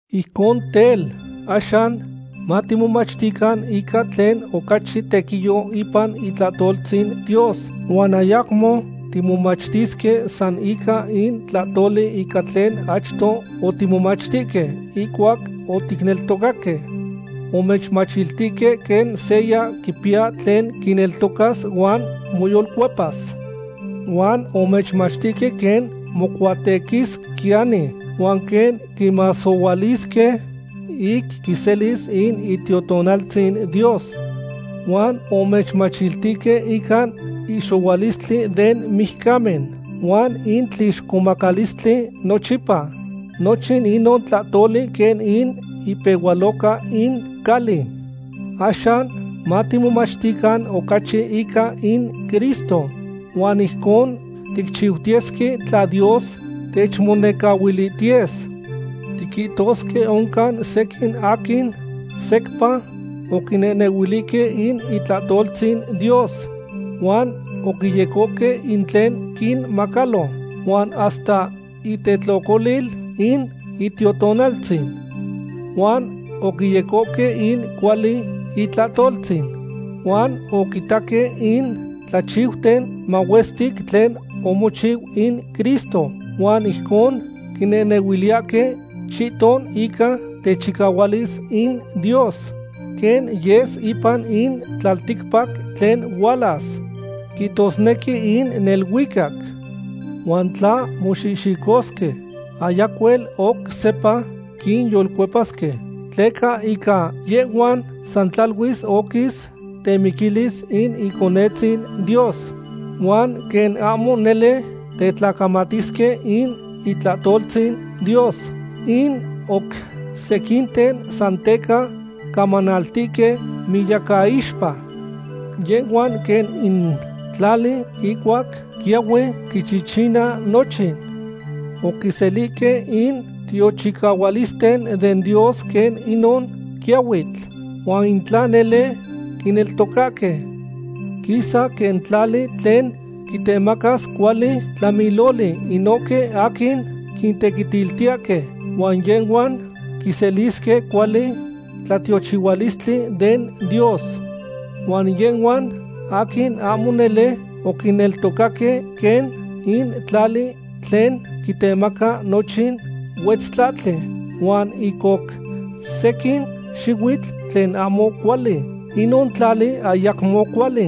Ijcon tel, axan matimomachtican ica tlen ocachi tequiyo ipan itlahtoltzin Dios huan ayacmo timomachtisque san ica in tlahtoli ica tlen achto otimomachtihque ihcuac oticneltocaque. Omechmachtihque quen seya quipiya tlen quineltocas huan moyolcuepas. Huan omechmachtihque quen mocuatequisquiyani huan quen quimasohualisque ic quiselis in Itiotonaltzin Dios. Huan omechmachtihque ica in ihxohualistli den mijcamen huan in tlixcomacalistli nochipa. Nochin inon tlahtoli quen in ipehualoca in cali. Axan matimomachtican ocachi ica in Cristo. Huan ijcon ticchiutiyesque tla Dios techmonecahuilihtiyes. Tiquihtosque oncan sequin aquin secpa oquinehnehuilihque in itlahtoltzin Dios huan oquiyecohque in tlen quinmacalo, huan hasta itetlocolil in Itiotonaltzin. Huan oquiyecohque in cuali itlahtoltzin, huan oquitaque in tlachiuten mahuestic tlen omochiu in Cristo huan ijcon quinehnehuiliyahque chihton ica techicahualis in Dios quen yes ipan in tlalticpac tlen hualas, quihtosnequi in neluicac. Huan tla moxihxicosque, ayacuel oc sepa quinyolcuepasque, tleca ica yehhuan san tlaluis oquis temiquilis in Iconetzin Dios huan quen ahmo nele tetlacamatisque in itlahtoltzin Dios, in oc sequinten san teca camanaltihque miyacaixpa. Yehhuan quen in tlali ihcuac quiyahui quichichina nochin. Oquiselihque in tiochihualisten den Dios quen inon quiyahuitl, huan in tla nele quineltocahque, quisa quen tlali tlen quitemacas cuali tlamiloli inohque aquin quitequitiltiyahque, huan yehhuan quiselisque cuali tlatiochihualistli den Dios. Huan yehhuan aquin ahmo nele oquineltocaque quen in tlali tlen quitemaca nochin huetztlahtli huan in oc sequin xihuitl tlen ahmo cuali. Inon tlali ayacmo cuali.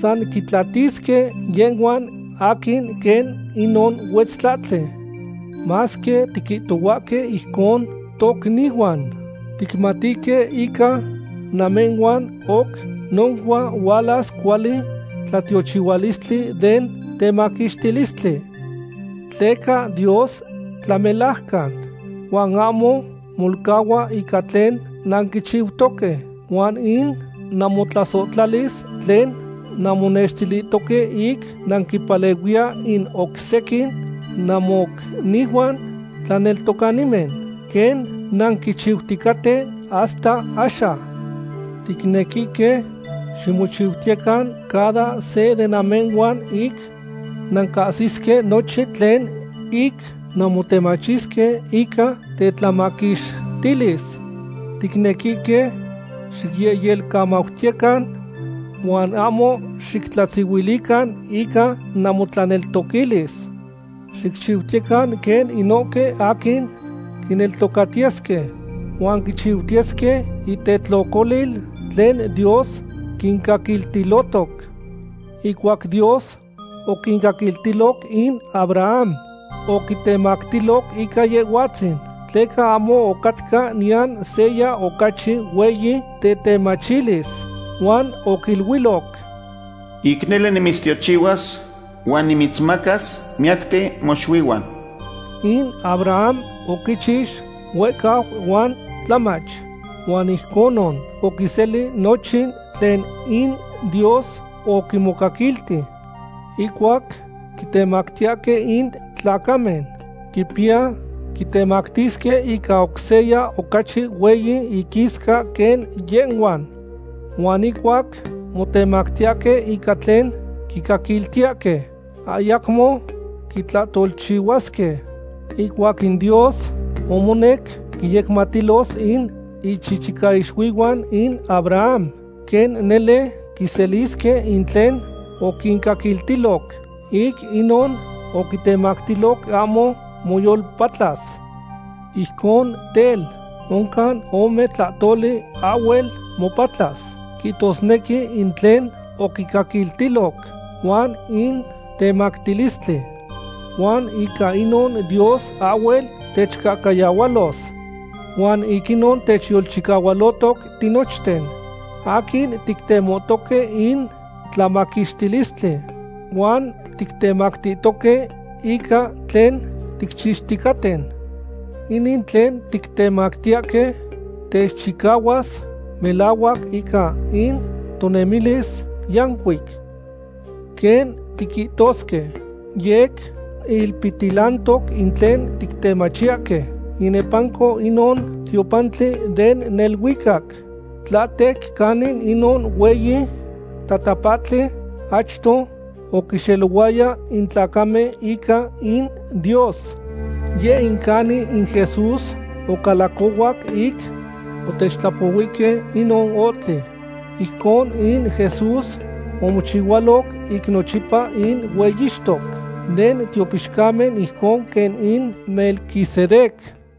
San quitlatisque yehhuan aquin quen inon huetzlahtli. Masque tiquihtohuahque ijcon, tocnihuan, ticmatihque ica namehhuan oc noncua hualas cuali tlatiochihualistli den temaquixtilistli. Tleca Dios tlamelajcan huan ahmo molcahua ica tlen nanquichiutoque huan in namotlasohtlalis tlen nanmonextilihtoque ic nanquimpalehuiya in oc sequin namocnihuan tlaneltocanimen, quen nanquichiuticaten hasta axan. Ticnequihque ximocuihcuitiyecan cada se de namehhuan ic nancahsisque nochin tlen ic nanmotemachisque ica tetlamaquixtilis. Ticnequihque xicyehyelcamautiyecan huan ahmo xictlatzihuilican ica namotlaneltoquilis. Xicchiutiyecan quen inohque aquin quineltocatiyesque huan quichistiyesque intetlocolil tlen Dios quincaquiltilohtoc. Ihcuac Dios oquicaquiltiloc in Abraham, oquitemactiloc ica Yehhuatzin, tleca ahmo ocatca niyan seya ocachi hueyi tetemachilis. Huan oquiluiloc: “Ic nele nimitztiochihuas huan nimitzmacas miyacten moxuihuan.” In Abraham oquichix huehcau huan tlamach, huan ijconon oquiseli nochin tlen in Dios oquimocaquilti. Ihcuac quitemactiyahque in tlacamen, quipiya quitemactisque ica oc seya ocachi hueyi iquisca quen yehhuan. Huan ihcuac motemactiyahque ica tlen quincaquiltiyahque, ayacmo quitlahtolchihuasque. Ihcuac in Dios omonec quinyecmatiltilos in ichichicaixuihuan in Abraham quen nele quiselisque in tlen oquincaquiltiloc, ic inon oquitemactiloc ahmo moyolpatlas. Ijcon tel, oncan ome tlahtoli ahhuel mopatlas, quihtosnequi in tlen oquicaquiltiloc huan in temactilistli. Huan ica inon Dios ahhuel techcahcayahualos. Huan ic inon techyolchicahualotoc tinochten aquin tictemohtoque in tlamaquixtilistli huan tictemachihtoque ica tlen ticchixticaten. Inin tlen tictemachiyahque techchicahuas melahuac ica in tonemilis yancuic. Quen tiquihtosque, yec ilpihtilantoc in tlen tictemachiyahque inepanco inon tiopantli den neluicac, tlahtec canin inon hueyi tatapahtli achto oquinxelohuaya in tlacamen ica in Dios. Yeh in canin in Jesús ocalacohuac ic otechtlapohuihque inon ohtli. Ijconon in Jesús omochihualoc ic nochipa in hueyixtoc den tiopixcamen ijcon quen in Melquisedec.